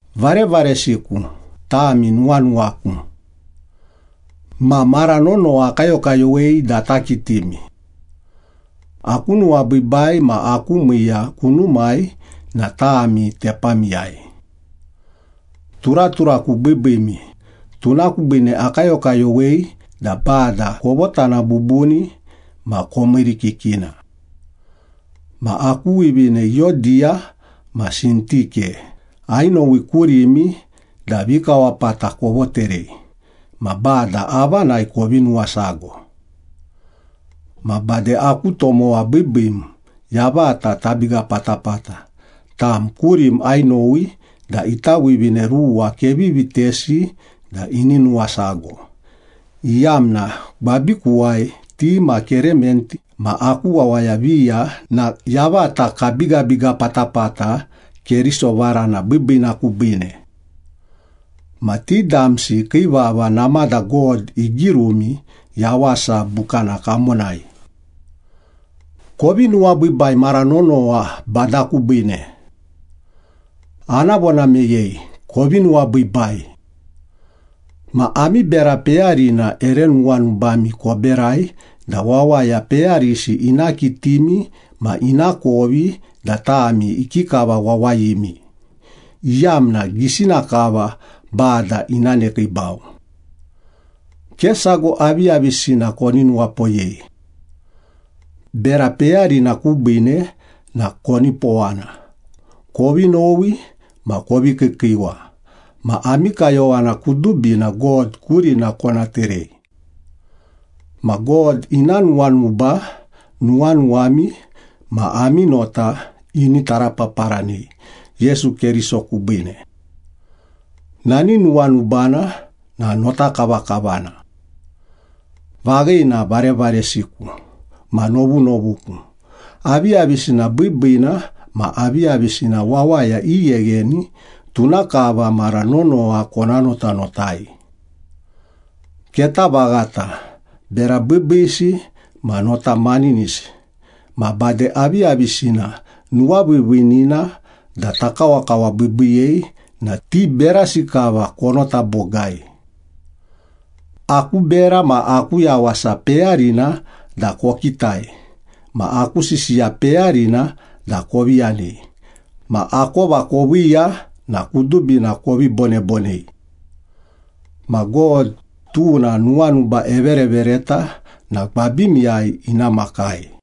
Varevaresiku, tami nuwanuwaku. Ma mara nonowa akayokayowei da ata kitimi. Aku nuwabiibai ma aku miiya kunumai na tami tepamiyai. Turaturaku biibiimi, tuna kubiine akayokayowei da Bada kovotana bubuni ma komiirikikina. Ma aku wivine Iyodiya ma Sintike ainowi kurimi da vikawapata kovoterei ma Bada avanai kovi nuwasago. Ma bade aku tomowa biibiim, yavata tabiga patapata, tam kurim ainowi da ita wivine ruwa kevi vitesi da ini nuwasago, iyamna gwabikuwai ti ma Kerement ma aku wawaya viya na yavata kabigabiga patapata Keriso varana biibiina kubiine. Ma ti damsi kii vava namada God igirumi Yawasa Bukana kamonai. Kovi nuwabiibai mara nonowa Bada kubiine. Ana vona meyei, kovi nuwabiibai! Ma ami bera peyarina ere nuwanubami koberai da wawaya peyarisi ina kitimi ma inakovi da tami ikikava wawayimi, iyamna gisina kava Bada ina nekiibau. Ke sago aviyavisina koni nuwapoyei. Bera peyarina kubiine na konipowana, kovi nowi ma kovi kiikiiwa ma ami kayowana kudubina God kurina kona terei. Ma God ina nuwanuba nuwanuwami ma ami nota ini tarapaparanei Yesu Keriso kubiine. Nani nuwanubana na notakavakavana. Vaghina, varevaresiku ma novunovuku, aviyavisina biibiina ma aviyavisina wawaya ighegheni, tuna kava mara nonowa kona notanotai. Keta vaghata, bera biibiisi ma nota maninisi, ma bade aviyavisina nuwaviiviinina da takawakawabiibiiyei na ti berasi kava konota bogai. Aku bera ma aku yawasa peyarina da kokitai ma aku sisiya peyarina da kovi yanei ma akova koviiya na kudubina kovi bonebonei. Ma God, tuna nuwanuba everevereta na gwabimiyai ina makai.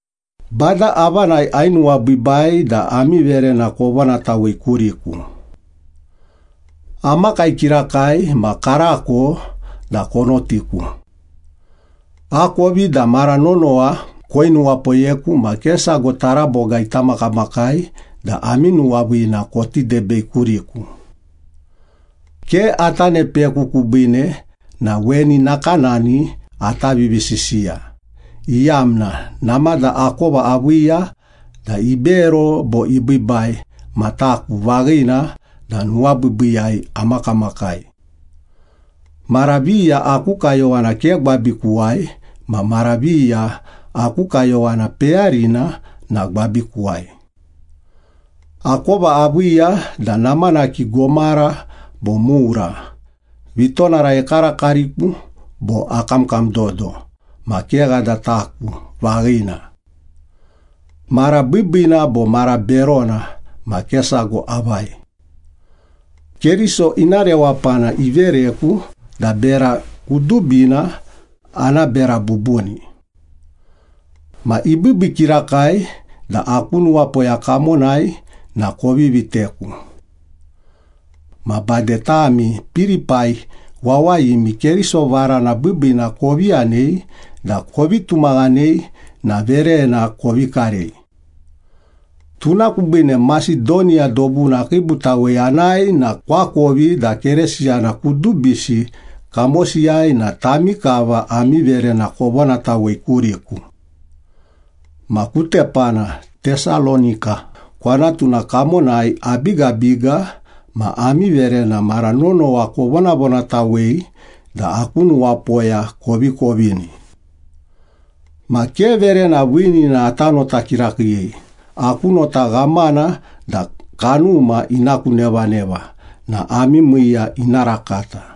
Bada avanai ainuwabiibai da ami verena kovonatawei kuriku. Amakai kirakai ma karako da konotiku. Akovi da mara nonowa koinuwapoyeku ma ke sago taraboga ita makamakai da ami nuwaviina koti debei kuriku. Ke ata ne peku kubiine na weni nakanani ata vivisisiya, iyamna namada akova aviiya da ibero bo ibiibai ma taku vaghina da nuwabiibiiyai amakamakai. Mara viya aku kayowana ke gwabikuwai ma mara viya aku kayowana peyarina na gwabikuwai. Akova aviiya da namanaki gomara bo mura, vitonara ekarakariku bo akamkam dodo ma kegha da taku vaghina. Mara biibiina bo mara berona ma ke sago avai. Keriso ina rewapana ivereku da bera kudubina ana bera bubuni. Ma ibiibii kirakai da aku nuwapoya kamonai na kovi viteku. Ma bade tami Pilipai wawayimi Keriso Varana Biibiina kovi yanei da kovi tumaghanei na verena kovi karei. Tuna kubiine Masedoniya dobuna akiibutawei anae na koakovi da Keresiyana kudubisi kamosiyai na tami kava ami verena kovonatawei kuriku. Ma ku tepana, Tesalonika kwanatuna kamonai abigabiga ma ami verena mara nonowa kovonavonatawei da aku nuwapoya kovi kovini. Ma ke verena viinina ata nota kirakiiyei, aku nota ghamana da kanuma ina ku nevaneva na ami miiya ina rakata.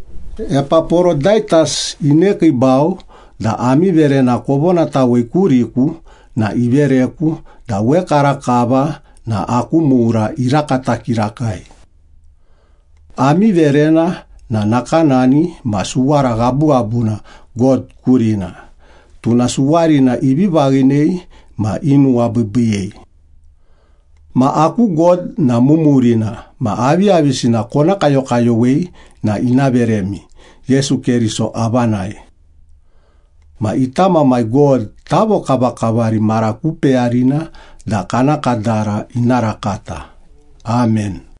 Epaporodaitas inekiibau da ami verena kovonatawei kuriku na ivereku da wekarakava na aku mura irakata kirakai. Ami verena na nakanani ma suwara ghabughabuna God kurina, tuna suwarina ivi vaghinei ma inuwabiibiiyei. Ma aku God na mumurina ma aviyavisina kona kayokayowei na ina veremi Yesu Keriso avanai. Ma ita Mamai God tavokavakavari mara ku peyarina da kana kadara ina rakata. Amen.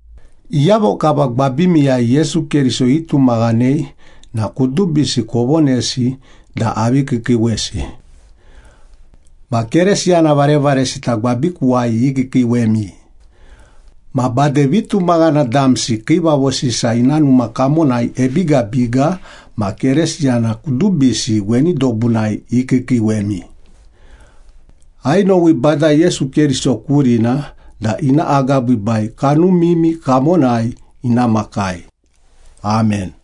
Iyavo kava gwabimiwai Yesu Keriso itumaghanei na kudubisi kovonesi da avi kiikiiwesi. Ma Keresiyana varevaresita gwabikuwai ikiikiiwemi. Ma bade vitumaghana damsi Kiivavo Sisa ina numa kamonai ebigabiga ma Keresiyana kudubisi weni dobunai ikiikiiwemi. Ainowi Bada Yesu Keriso kurina da ina agabiibai kanumimi kamonai ina makai. Amen.